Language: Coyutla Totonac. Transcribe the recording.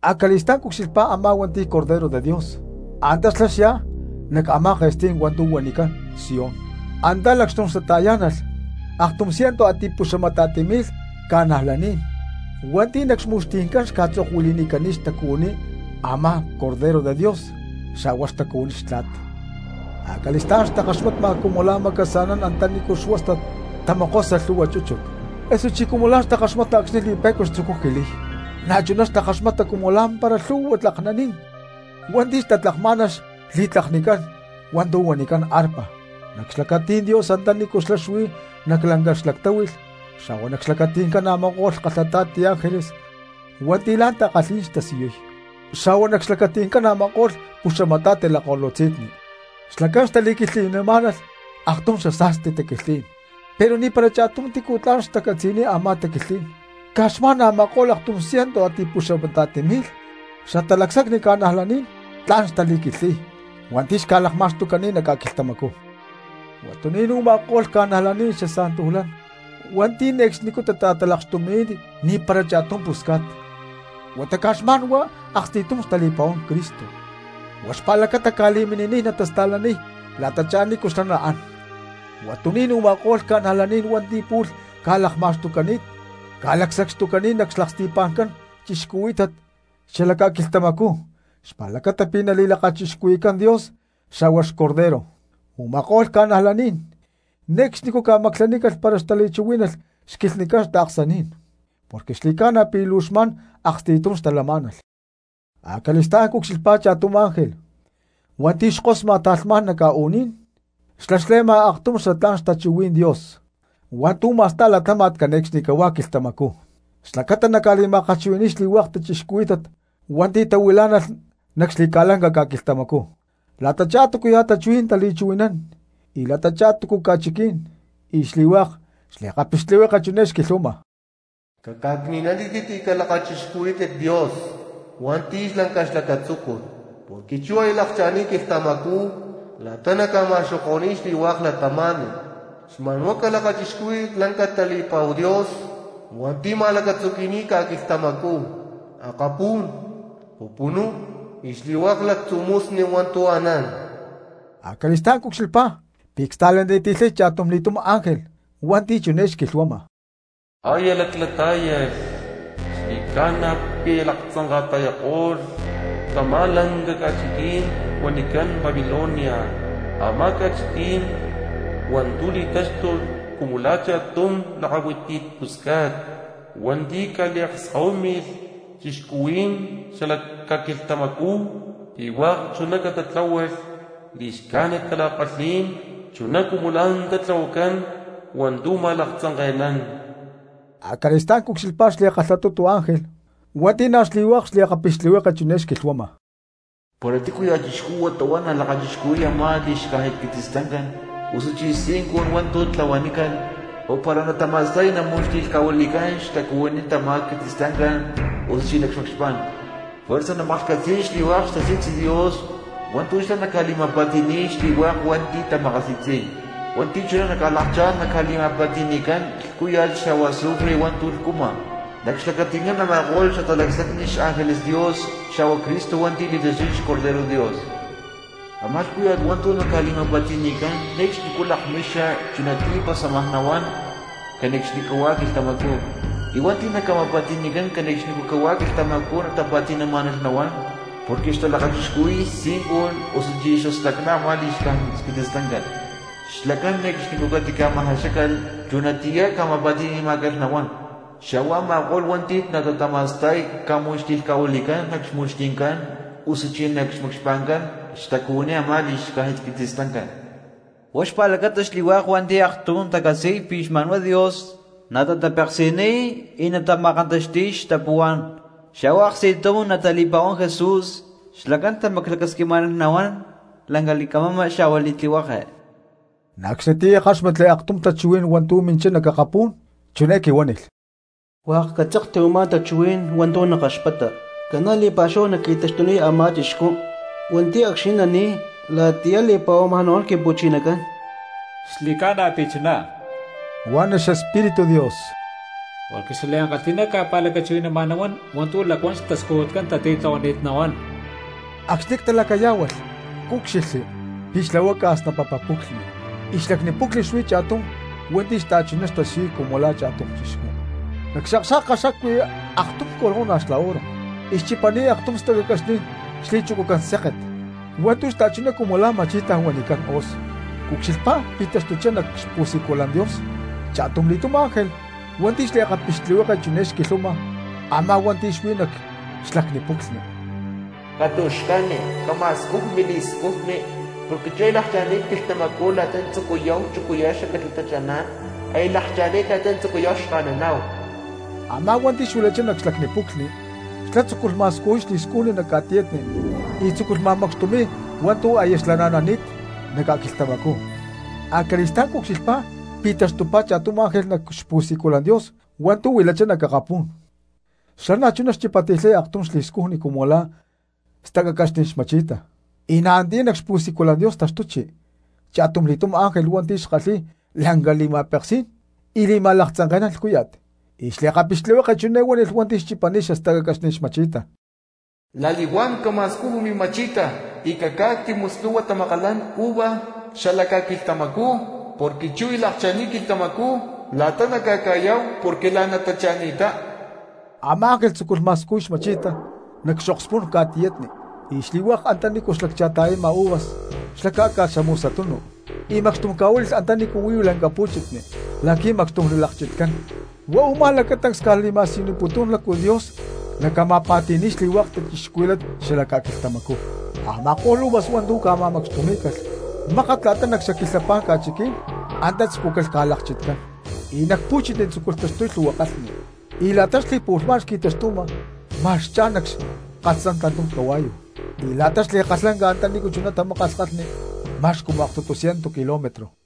Acali̠stá̠n cucxilhpá a̠má hua̠nti̠ li̠taxtuy xBorrego Dios, antá xlá xyá nac a̠má ke̠stí̠n hua̠ntu̠ huanicán Sión. Antá lacxtum xtata̠yá̠nalh aktum cientu a̠ti̠puxamata̠ti mi̠lh cristianos hua̠nti̠ nac xmu̠xti̠ncán xca̠tzokuili̠nicani̠t xtacuhuiní a̠má xBorrego Dios xa̠hua xtacuhuiní xtla̠t. Acali̠stá̠n xtakaxmata cumu la̠ macasa̠nán antanícu xuástat tamokosa lhu̠hua chúchut, osuchí cumu la̠ takaxmata acxni̠ li̠pe̠cua tzucuy jiliy; na̠chuná xtakaxmata cumu lá̠mpara lhu̠hua tlaknaní̠n hua̠nti̠ xtatlakmá̠nalh xli̠tlaknicán hua̠ntu̠ huanicán arpa. Nac xlacatí̠n Dios antanícu xlá xuí nac lanca xlactáhui̠lh xa̠hua nac xlacati̠ncán a̠ma̠ko̠lh kalhata̠ti ángeles hua̠nti̠ la̠ takalhí̠n xtasiyuy, xa̠hua nac xlacati̠ncán a̠ma̠ko̠lh puxamata̠ti lakko̠lutzí̠n, xlacán xtali̠quilhtli̠má̠nalh aktum xasa̠sti taquilhtlí̠n, pero ni̠para cha̠tum tícu tla̠n xtacatzi̠niy a̠má taquilhtlí̠n caj xma̠n a̠ma̠ko̠lh aktum cientu a̠ti̠puxamata̠ti mi̠lh xatalacsacni cristianos tla̠n xtali̠quilhtli̠y hua̠nti̠ xca̠lakma̠xtucani̠t nac ca̠quilhtamacú. Huatuní̠n u̠ma̠ko̠lh cristianos hua̠nti̠ ne̠cxnicú tata̠talakxtumi̠ni̠t ni̠para cha̠tum pusca̠t, huata caj xma̠n huá aksti̠tum xtali̠pa̠huán Cristo, huá xpa̠lacata ca̠li̠mini̠niy natasta̠laniy la̠tachá nícu xlá naán. Huatuní̠n u̠ma̠ko̠lh cristianos hua̠nti̠ pu̠lh ca̠lakma̠xtucani̠t ca̠lacsacxtucani̠t nac xlaksti̠pa̠ncán cristianos xalac ca̠quilhtamacú xpa̠lacata pi̠ nali̠lakachixcuhui̠cán Dios xa̠hua xBorrego. Uma̠kó̠lh cristianos ne̠cxnicú ca̠maclanícalh para xtali̠chuhuí̠nalh xquilhnicán taaksaní̠n, porque xli̠ca̠na pi̠ luu xma̠n aksti̠tum xtalamá̠nalh. Acali̠stá̠n cucxilhpá cha̠tum ángel hua̠nti̠ xkosma ta̠lhmá̠n nac ca̠u̠ní̠n, xlá xle̠ma aktum xatlá̠n xtachuhuí̠n Dios hua̠ntu̠ ma̠sta̠y latáma̠t cane̠cxnicahuá quilhtamacú, xlacata naca̠li̠ma̠kalhchuhui̠ni̠y xli̠hua̠k cristianos hua̠nti̠ tahuilá̠nalh nac xli̠ca̠lanca ca̠quilhtamacú, la̠tachá túcuya̠ tachuhuí̠n tali̠chuhui̠nán y la̠tachá túcu ca̠chiquí̠n. Y xli̠hua̠k xliakapixtlihueke chiné xquilhuama: —Caca̠cni̠nanítit y calakachixcuhuí̠tit Dios hua̠nti̠ lanca xlacatzúcut, porque chú aya lakcha̠ni̠t quilhtamacú la̠ta naca̠ma̠xoko̠ni̠y xli̠hua̠k cristianos. Xma̠n huá calakachixcuhuí̠tit la̠nca tali̠pa̠hu Dios hua̠nti̠ ma̠lacatzuqui̠ni̠t ca̠quilhtamacú, akapú̠n, pupunú y xli̠hua̠k lactzu̠ musni hua̠ntu̠ anán. Acali̠stá̠n cucxilhpá pi̠ csta̠laniti̠lhay cha̠tumli̠túm ángel hua̠nti̠ chiné xquilhuama: —¡Aya laclatá̠yalh, xli̠ca̠na pi̠ aya laktzanka̠ta̠yako̠lh tamá lanca ca̠chiquí̠n huanicán Babilonia, a̠má ca̠chiquí̠n hua̠ntu̠ li̠táxtulh cumu la̠ cha̠tum lakahuiti pusca̠t hua̠nti̠ ca̠li̠akskahuími̠lh cristianos xalac ca̠quilhtamacú pi̠ hua̠k chuná catatláhualh li̠xcájnit tala̠kalhí̠n chuná cumu la̠ antá tlahuacán hua̠ntu̠ ma̠laktzanke̠nán! Acali̠stá̠n cucxilhpá xli̠kalhatutu ángel hua̠nti̠ na̠ xli̠hua̠k xliakapixtlihueke chiné xquilhuama: —Para tícuya̠ cristianos huata huá nalakachixcuhui̠y a̠má li̠xcájnit quitzistancán, osuchí xtzincun hua̠ntu̠ tlahuanícalh, o para natama̠sta̠y namu̠xti̠lhca̠huili̠cán xtacuhuiní tamá quitzistancán osuchí nac xmacxpá̠n. Juerza namaklhcatzi̠y xli̠hua̠k xtasi̠tzi Dios hua̠ntu̠ xlá naca̠li̠ma̠pa̠ti̠ni̠y xli̠hua̠k hua̠nti̠ tamakasi̠tzi̠y, hua̠nti̠ chuná naca̠lakchá̠n naca̠li̠ma̠pa̠ti̠ni̠cán lhcúya̠t xa̠hua azufre hua̠ntu̠ lhcuma, nac xlacati̠ncán a̠ma̠ko̠lh xatalacsacni xángeles Dios xa̠hua Cristo hua̠nti̠ li̠taxtuy xBorrego. Amá lhcúya̠t hua̠ntu̠ naca̠li̠ma̠pa̠ti̠ni̠cán ne̠cxnicú lakmixa chunatiyá pasámaj nahuán cane̠cxnicahuá quilhtamacú, y hua̠nti̠ naca̠ma̠pa̠ti̠ni̠cán cane̠cxnicahuá quilhtamacú tapa̠ti̠namá̠nalh nahuán, porque xtalakachixcuhui̠y xtzincun osuchí xastacná a̠má li̠xcájnit quitzistancán, xlacán ne̠cxnicú catica̠ma̠jaxácalh chunatiyá ca̠ma̠pa̠ti̠ni̠má̠calh nahuán, xa̠hua a̠ma̠ko̠lh hua̠nti̠ natatama̠sta̠y caca̠mu̠xti̠lhca̠huilí̠calh nac xmu̠xti̠ncán osuchí nac xmacxpa̠ncán xtucuhuiní a̠má li̠xcájnit quitzistancán. Huá xpa̠lacata xli̠hua̠k hua̠nti̠ aktum tacatzi̠y pi̠ xma̠n huá Dios natatapeksi̠niy y natama̠kantaxti̠y xtapuhuá̠n, xa̠hua aksti̠tum natali̠pa̠huán Jesús, xlacán tamaclacasquimá̠nalh lanca li̠camama xa̠hua li̠tlihueke. Na̠ acxnitiyá ckáxmatli aktum tachuhuí̠n hua̠ntu̠ minchá nac akapú̠n, chiné quihuánilh: —Hua̠k catzokti u̠má tachuhuí̠n hua̠ntu̠ nakaxpata: “Ca̠na li̠pa̠xúhu naqui̠taxtuniy a̠má cristiano hua̠nti̠ acxni̠ nani̠y la̠tiyá li̠pa̠huama nahuán Quimpu̠chinacán.” —Xli̠ca̠na pi̠ chuná —huan xEspíritu Dios—, porque xlacán maktumá tu̠ natajaxa y niaj tu̠ catica̠li̠ma̠scujúcalh, porque xliankalhi̠ná ca̠pa̠lacachuhui̠nama nahuán hua̠ntu̠ lacuán xtascujutcán tatitlahuani̠t nahuán. Acxni̠ ctalacayá̠hualh, cúcxilhli pi̠ xlahuaca snapapa puclhni, y nac xlacni puclhni xuí cha̠tum hua̠nti̠ xta̠chuná xtasiyuy cumu la̠ cristiano. Nac xakxa̠ka xacuí aktum corona xla oro, y xchipani̠t aktum stacacaxní̠n xli̠chucucán séket hua̠ntu̠ xta̠chuná cumu la̠ ma̠chi̠ta huanicán hoz. Cucxilhpá pi̠ taxtuchá nac xpu̠siculan Dios cha̠tumli̠túm ángel hua̠nti̠ xliakapixtlihueke chiné xquilhanima a̠má hua̠nti̠ xuí nac xlacni puclhni: —Catu̠xca̠ni, cama̠scuju mili̠scujni, porque chú aya lakcha̠ni̠t quilhtamacú la̠ta natzucuya chucuya xacatla tachaná̠n, aya lakcha̠ni̠t la̠ta natzucuyá̠hu xka̠naná̠hu. Amá hua̠nti̠ xuilachá nac xlacni puclhni, xlá tzúculh ma̠scujuy xli̠scujni nac ca̠tiyatni y tzúculh ma̠macxtumi̠y hua̠ntu̠ aya xlana̠nani̠t nac ca̠quilhtamacú. Acali̠stá̠n cucxilhpá pi̠ taxtupá cha̠tum ángel nac xpu̠siculan Dios hua̠ntu̠ huilachá nac akapú̠n, xlá na̠chuná xchipati̠lhay aktum li̠scujni cumu la̠ stacacaxní̠n xma̠chi̠ta. Y antiyá nac xpu̠siculan Dios taxtuchi cha̠tumli̠túm ángel hua̠nti̠ kalhi̠y lanca li̠ma̠peksí̠n y li̠ma̠laktzanke̠nán lhcúya̠t, y xliakapixtlihueke chiné huánilh hua̠nti̠ xchipani̠t xastacacaxní̠n xma̠chi̠ta: —La̠li̠huán cama̠scuju mima̠chi̠ta y cacá̠ca̠cti muslhu̠hua tamakalán xla uva xala ca̠quilhtamacú, porque chú aya lakcha̠ni̠t quilhtamacú la̠ta naca̠ca̠yá̠hu porque la̠n tacha̠ni̠ttá. Ama̠ ángel tzúculh ma̠scujuy xma̠chi̠ta nac xokspú̠n ca̠tiyatni, y xli̠hua̠k antanícu xlaccha̠ta̠yama uvas xlá cá̠ca̠lh xamusatunu, y macxtum ca̠huíli̠lh antanícu huí lanca pu̠chitni la̠qui̠ macxtum nalakchitcán. Huá u̠má lacatancs li̠ma̠siyuputún lácu Dios naca̠ma̠pa̠ti̠ni̠y xli̠hua̠k cristianos xalac ca̠quilhtamacú. Ama̠ko̠lh uvas hua̠ntu̠ ca̠ma̠macxtumí̠calh, mákat la̠ta nac xaquilhapá̠n ca̠chiquí̠n antá tzucúcalh ca̠lakchitcán; y nac pu̠chitni tzúculh taxtuy lhu̠hua kalhni, y la̠ta xli̠pu̠lhmá̠n xqui̠taxtuma ma̠x xcha̠n nac xkalhtzán tantum cahua̠yu, y la̠ta xli̠kalhlanca antanícu chuná tamákalh kalhni ma̠x cumu aktutu cientu kilómetro.